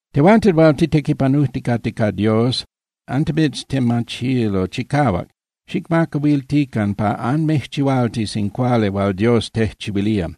Tehuanten hual titequipanujticate ca Dios, antimitztemachilo chicahuac, xicmacahuiltican pa anmijchihualtis in cuali hual Dios tejchihuilía.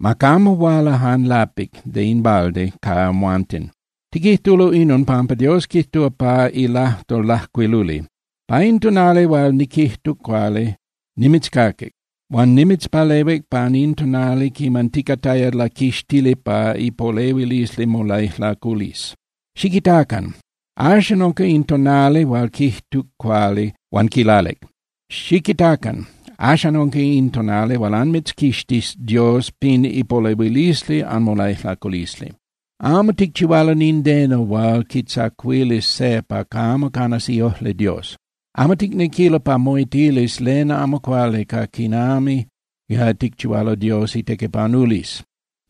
Ma camo huala jan lapic (de in balde) ca amhuanten. Tiquijtulo inon, pampa Dios quijtúa pa ilajtol lajcuiluli: Pa in tonali hual niquijtuc cuali, nimitzcaquic, huan nimitzpalehuic pan in tonali quiman ticataya laquixtili pa ipolehuilisli molaijlaculisli. Xiquitacan. Axan unca in tonali hual quijtuc cuali huan quilalic. Xiquitacan. Axan unca in tonali hual anmitzquixtis Dios pin ipolehuilisli anmolaijlaculisli. Amo ticchihualo nindeno hual quitzacuilis se pa camo canas iojli Dios. Amo ticnequilo pa moitilis len amo cuali ca quinami ticchihualo Dios itequipanulisli.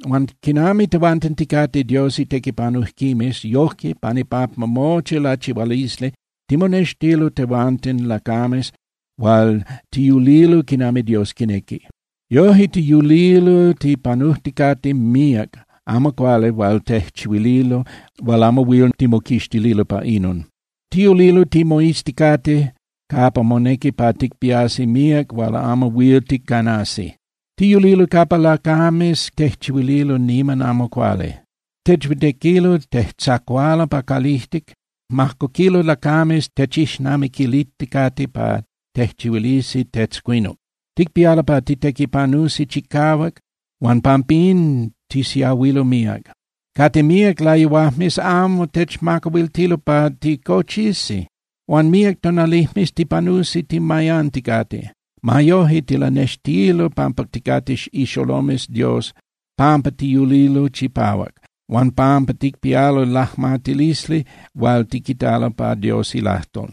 Huan quinami tehuanten ticate Dios itequipanujquimes, yoje pan ipampa mochi lachihualisli, timonextilo tehuanten lacames hual tiyulilo quinami Dios quinequi. Yoje tiyulilo tipanujticate míac amo cuali hual tejchihuililo hual amo huil timoquixtililo pa inon. Tiyulilo timoizticate capa monequi pa ticpiasi míac hual amo huil ticanasi. Tiyulilo capa lacames tejchihuililo niman amo cuali. Techhuitequilo, tejtzacualo pa calijtic, majcoquilo lacames techixnamiquilijticate pa tejchihuilisi tetzcuinuc. Ticpialo pa titequipanusi chicahuac huan pampín tisiahuilo míac. Cate míac layuajmes amo techmacahuiltilo pa ticochisi, huan míac tonalijmes tipanusi timayanticate. Ma yoje tilanextilo pampa ticate ixolomes Dios pampa tiyulilo chipahuac huan pampa ticpialo lajmatilisli hual tiquitalo pa Dios ilajtol.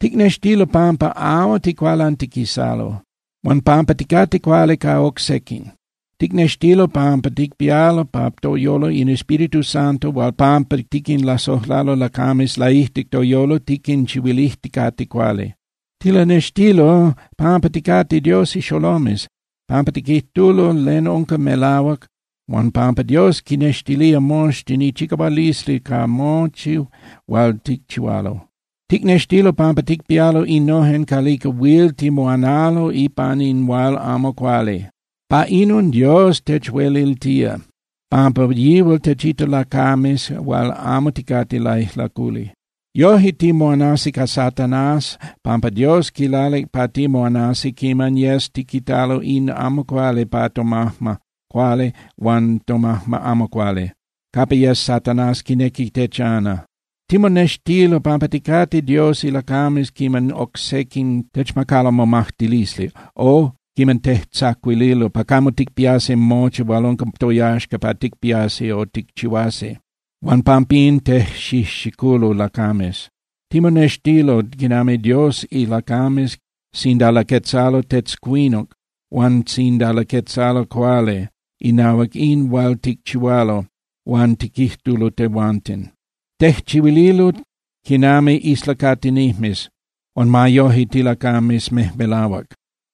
Ticnextilo pampa amo ticualantiquisalo, huan pampa ticate cuali ca oc sequin. Ticnextilo pampa ticpialo pa toyolo in Espíritu Santo huan pampa tiquinlasojlalo lacames laijtic toyolo tiquinchihuilijticate cuali. Tilanextilo pampa ticate Dios ixolomes pampa tiquijtulo len unca melahuac, huan pampa Dios quinnextilía moxtin ichicahualisli ca mochi hual ticchihualo. Ticnextilo pampa ticpialo innojen calica huil timoanalo ipan in hual amo cuali. Pa inon Dios techueliltía, pampa yihual techita lacames hual amo ticate laijlaculi. Yoje timoanasi ca Satanás pampa Dios quilalic pa timoanasi quiman yes tiquitalo in amo cuali pa tomajma cuali huan tomajma amo cuali, capa yes Satanás quinequi techana. Timonextilo pampa ticate Dios ilacames quiman oc sequin techmacalo momajtilisli o quiman tejtzacuililo pa camo ticpiasi mochi hual unca toyaxca pa ticpiasi o ticchihuasi, huan pampín tejxijxiculo lacames. Timonextilo quinami Dios ilacames sinda laquetzalo tetzcuinuc huan sinda laquetzalo cuali inahuac in hual ticchihualo huan tiquijtulo tehuanten. Tejchihuililo quinami islacatinijmes, huan ma yoje tilacames mejmelahuac.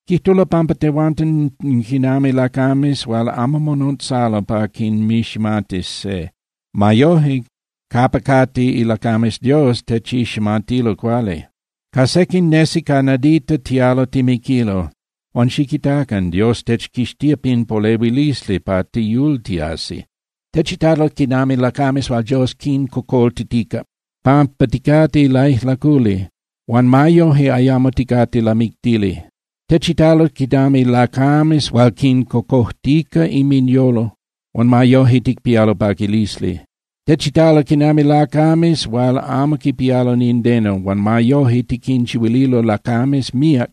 Quijtulo pampa tehuanten quinami lacames hual amo monotzalo pa quinmiximatis se. Ma yoje, capa cate ilacames Dios techiximatilo cuali. Ca sequin nesi ca nadita tialo timiquilo, huan ¡xiquitacan! Dios techquixtía pin polehuilisli pa tiyultiasi. Techitalo quinami lacames hual Dios quincocoltitica pampa ticate laijlaculi huan ma yoje ayamo ticate lamictili. Techitalo quinami lacames hual quincocojtica inminyolo huan ma yoje ticpialo paquilisli. Techitalo quinami lacames hual amo quipialo nindeno, huan ma yoje tiquinchihuililo lacames míac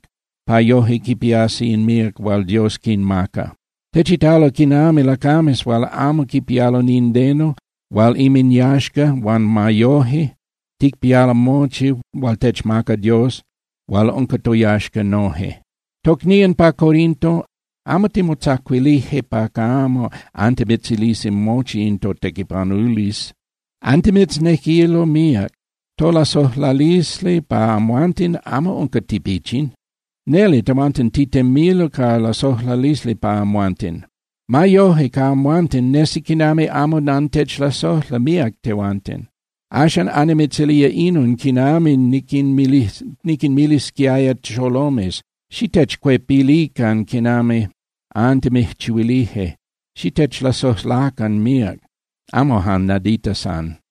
pa yoje quipiasi in míac hual Dios quinmaca. Techitalo quinami lacames hual amo quipialo nindeno hual inminyaxca huan ma yoje ticpialo mochi hual techmaca Dios hual unca toyaxca noje. Tocnían pa Corinto, amo timotzacuilije pa camo antimitzilisi mochi in totequipanulisli. Antimitznequilo míac. Tolasojlalisli pa amhuanten amo unca tipichin. Neli tehuanten titemilo ca lasojlalisli pa amhuanten. Ma yoje ca amhuanten, nesi quinami amo antechlasojla míac tehuanten. Axan annimitzilía inon quinami niquinmilisquiaya xolomes: Xitechcuepilican quinami antimijchihuilije, xitechlasojlacan míac, amo jan nadita san.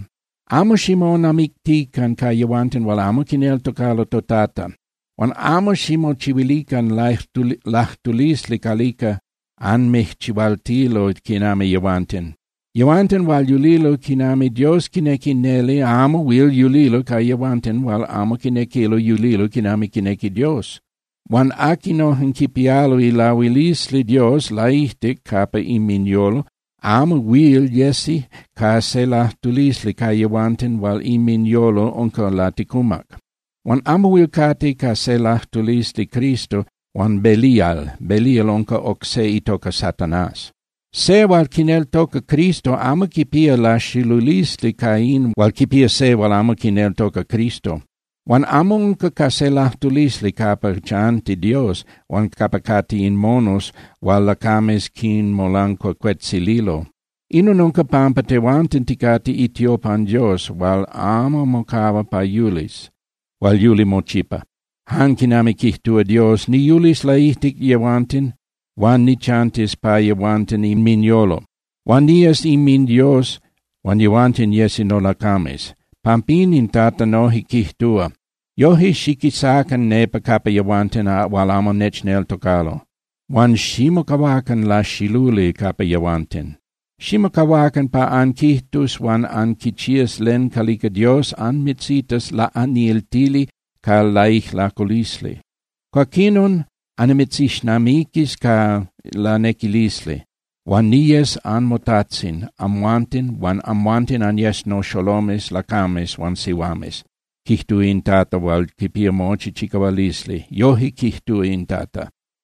Amo ximonamictican ca yehuanten hual amo quineltocalo toTata. Huan amo ximochihuilican lajtulisli calica anmijchihualtilo quinami yehuanten. Yehuanten hual yulilo quinami Dios quinequi neli amo huil yulilo ca yehuanten hual amo quinequilo yulilo quinami quinequi Dios. Huan aquinojen quipialo ilahuilisli Dios laijtic capa inminyolo amo huil yesi ca se lajtulisli ca yehuanten hual inminyolo unca laticumac. Huan amo huil cate ca se lajtulisli Cristo huan Belial. (Belial unca oc se itoca Satanás.) Se hual quineltoca Cristo amo quipía laxilulisli ca in hual quipía se hual amo quineltoca Cristo. Huan amo unca ca se lajtulisli capa chanti Dios huan capa cate in monos hual lacames quinmolancuacuetzililo. Inon unca pampa tehuanten ticate itiopan Dios hual amo mocahua pa yulis (hual yuli mochipa), jan quinami quijtúa Dios: Niyulis laijtic yehuanten huan nichantis pa yehuanten inminyolo, huan niyes inminDios huan yehuanten yesi nolacames. Pampín, in Tata noje quijtúa: Yoje, xiquisacan nepa capa yehuanten hual amo nechneltocalo, huan ximocahuacan laxiluli capa yehuanten, ximocahuacan pa anquijtus huan anquichías len calica Dios anmitzitas laꞌaniltili ca laijlaculisli. Cuaquinon annimitzixnamiquis ca lanequilisli, huan niyes anmoTajtzin amhuanten huan amhuanten anyes noxolomes lacames huan sihuames, quijtúa in Tata hual quipía mochi chicahualisli. Yoje quijtúa in Tata.